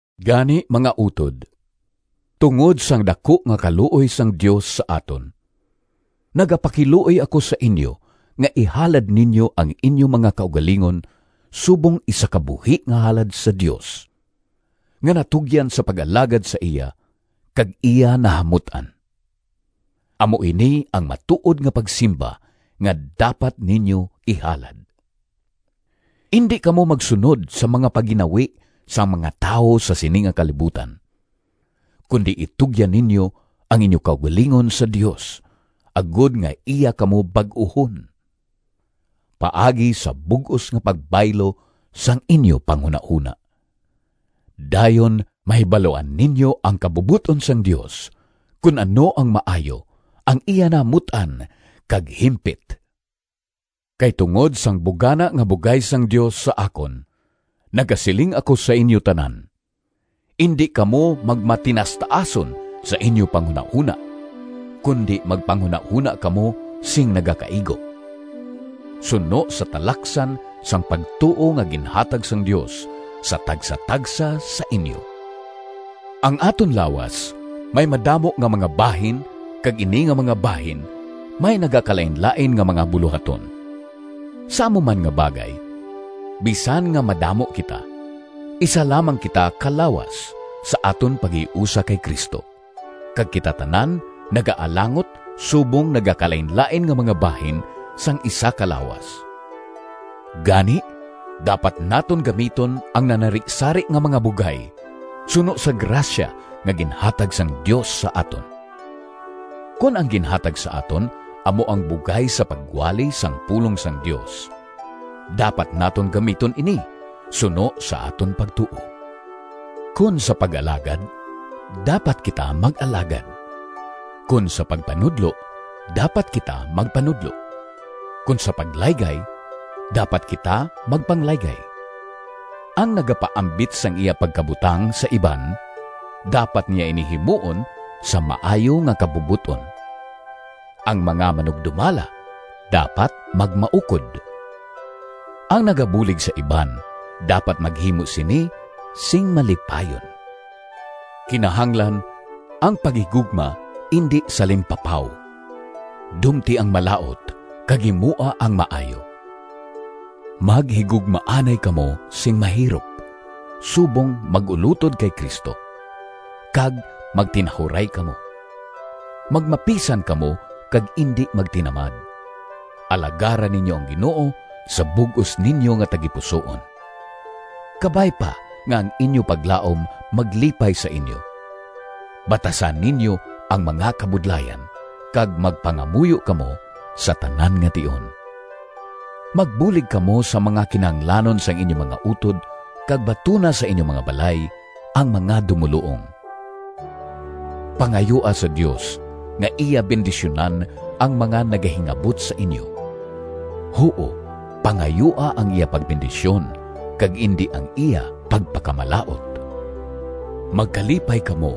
Gani, mga utod, tungod sang daku nga kaluoy sang Dios sa aton, nagapakiluoy ako sa inyo nga ihalad ninyo ang inyo mga kaugalingon subong isa ka buhi nga halad sa Dios, nga natugyan sa pag-alagad sa iya kag iya nahamut-an. Amo ini ang matuod nga pagsimba nga dapat ninyo ihalad. Indi kamo magsunod sa mga pagginawi sang mga tawo sa sini nga kalibutan, kundi itugyan ninyo ang inyo kaugalingon sa Dios agod nga iya kamo bag-uhon, paagi sa bug-os nga pagbaylo sang inyo panghunahona. Dayon mahibaluan ninyo ang kabubot-on sang Dios, kon ano ang maayo, ang iya nahamut-an, kag himpit. Kay tungod sang bugana nga bugay sang Dios sa akon, nagasiling ako sa inyo tanan: Indi kamo magmatinaastaason sa inyo panghunahona, kundi magpanghunahona kamo sing nagakaigo, suno sa talaksan sang pagtuo nga ginhatag sang Dios sa tagsatagsa sa inyo. Ang aton lawas may madamo nga mga bahin kag ini nga mga bahin may nagakalainlain nga mga bulohaton. Sa amo man nga bagay, bisan nga madamo kita, isa lamang kita ka lawas sa aton paghiusa kay Cristo, kag kita tanan nagaalangot subong nagakalainlain nga mga bahin sang isa ka lawas. Gani, dapat naton gamiton ang nanarisari nga mga bugay suno sa grasya nga ginhatag sang Dios sa aton. Kon ang ginhatag sa aton amo ang bugay sa pagwali sang pulong sang Dios, dapat naton gamiton ini suno sa aton pagtuo. Kon sa pag-alagad, dapat kita mag-alagad. Kon sa pagpanudlo, dapat kita magpanudlo. Kon sa paglaygay, dapat kita magpanglaygay. Ang nagapaambit sang iya pagkabutang sa iban, dapat niya ini himuon sa maayo nga kabubot-on. Ang mga manugdumala dapat magmaukod. Ang nagabulig sa iban, dapat maghimo sini sing malipayon. Kinahanglan ang paghigugma indi salimpapaw. Dumti ang malaut, kag himoa ang maayo. Maghigugmaanay kamo sing mahirop subong mag-ulotod kay Cristo, kag magtinahuray kamo. Magmapisan kamo kag indi magtinamad. Alagara ninyo ang Ginoo sa bug-os ninyo nga tagipusoon. Kabay pa nga ang inyo paglaom maglipay sa inyo, batasa ninyo ang mga kabudlayan, kag magpangamuyo kamo sa tanan nga tion. Magbulig kamo sa mga kinahanglanon sang inyo mga utod kag batuna sa inyo mga balay ang mga dumoluong. Pangayoa sa Dios nga iya bendisyunan ang mga nagahingabot sa inyo. Huo, pangayoa ang iya pagbendisyon kag indi ang iya pagpakamalaut. Magkalipay kamo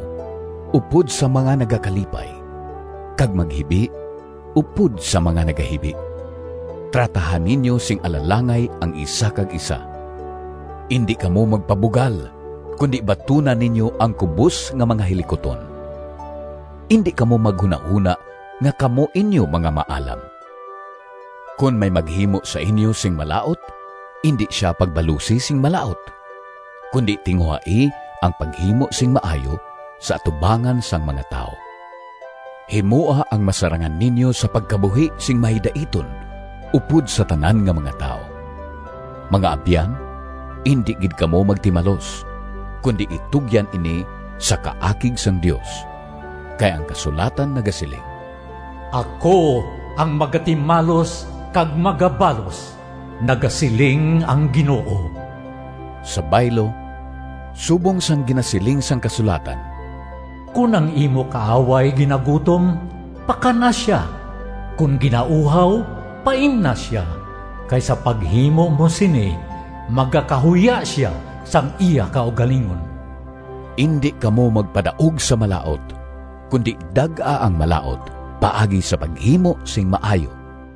upod sa mga nagakalipay, kag maghibi upod sa mga nagahibi. Trataha ninyo sing alalangay ang isa kag isa. Indi kamo magpabugal, kundi batuna ninyo ang kubos nga mga hilikuton. Indi kamo maghunahona nga kamo inyo mga maalam. Kon may maghimo sa inyo sing malaut, indi sia pagbalusi sing malaut, kundi tinguhai ang paghimo sing maayo sa atubangan sang mga tawo. Himoa ang masarangan ninyo sa pagkabuhi sing mahidaiton upod sa tanan nga mga tawo. Mga abyan, indi gid kamo magtimalos, kundi itugyan ini sa kaakig sang Dios. Kay ang kasulatan nagasiling, “Ako ang magatimalos kag magabalos, nagasiling ang Ginoo.” Sa baylo, subong sang ginasiling sang kasulatan: “Kon ang imo kaaway ginagutom, pakan-a sia; kon ginauhaw, paimna sia, kay sa paghimo mo sini, magakahuya sia sang iya kaugalingon.” Indi kamo magpadaog sa malaut, kundi dag-a ang malaut paagi sa paghimo sing maayo.